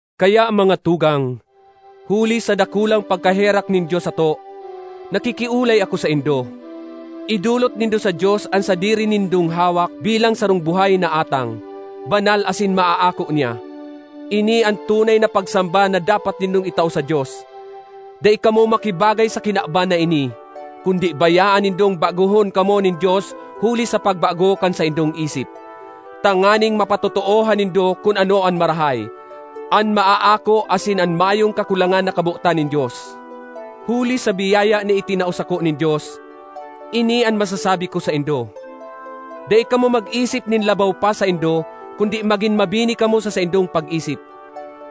Kaya, mga tugang, huli sa dakulang pagkaherak nin Dios sato, nakikiolay ako saindo: Idolot nindo sa Dios an sadiri nindong hawak bilang sarong buhay na atang, banal asin maaako niya. Ini an tunay na pagsamba na dapat nindong itao sa Dios. Dai kamo makibagay sa kinaban na ini, kundi bayaan nindong bagohon kamo nin Dios huli sa pagbago kan saindong isip, tanganing mapatotoohan nindo kun ano an marahay, an maaako asin an mayong kakulangan na kabotan nin Dios. Huli sa biyaya na itinao sako nin Dios, ini an masasabi ko saindo: Dai kamo mag-isip nin labaw pa saindo kundi magin mabini kamo sa saindong pag-isip.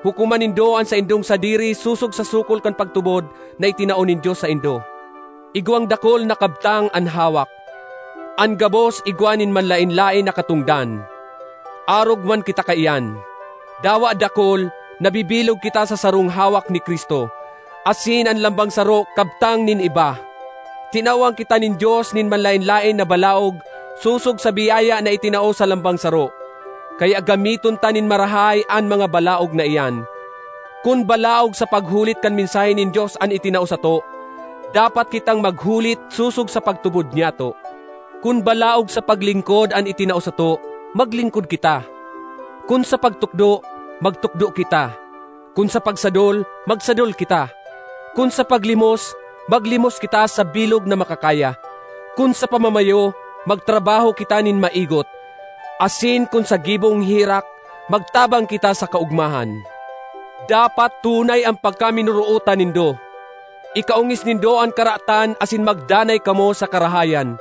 Hukoman nindo an saindong sadiri sosog sa sukol kan pagtubod na itinao nin Dios saindo. Igwang dakul na kabtang an hawak; an gabos igwa nin manlaen-laen na katongdan. Arog man kita kaiyan: dawa dakul, nabibilog kita sa sarong hawak ni Cristo; asin an lambang saro kabtang nin iba. Tinawan kita nin Dios nin manlaen-laen na balaog sosog sa biyaya na itinao sa lambang saro. Kaya gamiton ta nin marahay an mga balaog na iyan. Kun balaog sa paghulit kan mensahe nin Dios an itinao sato, dapat kitang maghulit sosog sa pagtubod nyato. Kun balaog sa paglingkod an itinao sato, maglingkod kita; kun sa pagtukdo, magtukdo kita; kun sa pagsadol, magsadol kita; kun sa paglimos, maglimos kita sa bilog na makakaya; kun sa pamamayo, magtrabaho kita nin maigot; asin kun sa gibong-herak, magtabang kita sa kaogmahan. Dapat tunay an pagkaminorootan nindo. Ikaongis nindo an karatan asin magdanay kamo sa karahayan.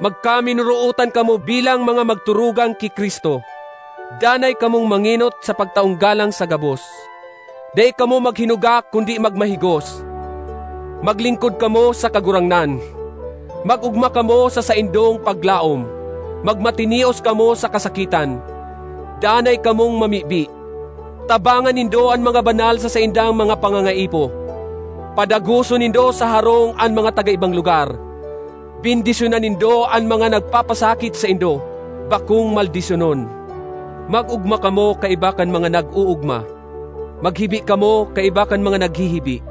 Magkaminorootan kamo bilang mga magturugang ki Cristo; danay kamong mangenot sa pagtaong galang sa gabos. Dai kamo maghinugak kundi magmahigos; maglingkod kamo sa Kagurangnan. Mag-ogma kamo sa saindong paglaom; magmatinios kamo sa kasakitan. Danay kamong mamibi. Tabangan nindo an mga banal sa saindang mga pangangaipo; padagoson nindo sa harong an mga taga ibang lugar. Bendisyonan nindo an mga nagpapasakit saindo, bakong maldisyonon. Mag-ogma kamo kaiba kan mga nag-oogma; maghibi kamo kaiba kan mga naghihibi.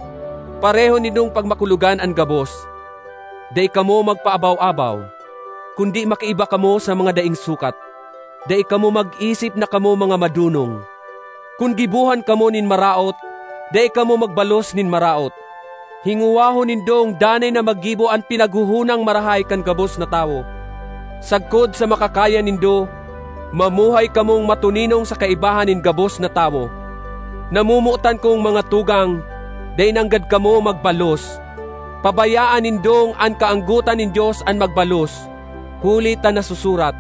Pareho nindong pagmakulogan an gabos. Dai kamo magpaabaw-abaw, kundi makiiba kamo sa mga daing sukat. Dai kamo mag-isip na kamo mga madonong. Kun gibohan kamo nin maraot, dai kamo magbalos nin maraot. Hingowahon nindong danay na magibo an pinaghohonang marahay kan gabos na tawo. Sagkod sa makakaya nindo, mamuhay kamong matoninong sa kaibahan nin gabos na tawo. Namomotan kong mga tugang, dai nanggad kamo magbalos; pabayaan nindong an kaanggotan nin Dios an magbalos, huli ta nasusurat,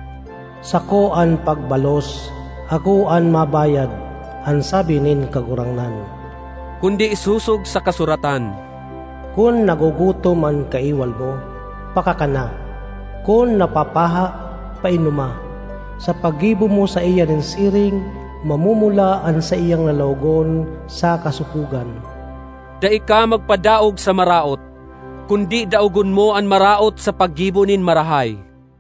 “Sako an pagbalos, ako an mabayad, an sabi nin Kagurangnan.” Kundi sosog sa kasuratan, “Kun nagugutom an kaiwal mo, pakakana; kun napapaha, painoma. Sa paggibo mo saiya nin siring, mamumula an saiyang lalawogon sa kasopogan.” Dai ka magpadaog sa maraot, kundi daogon mo an maraot sa paggibo nin marahay.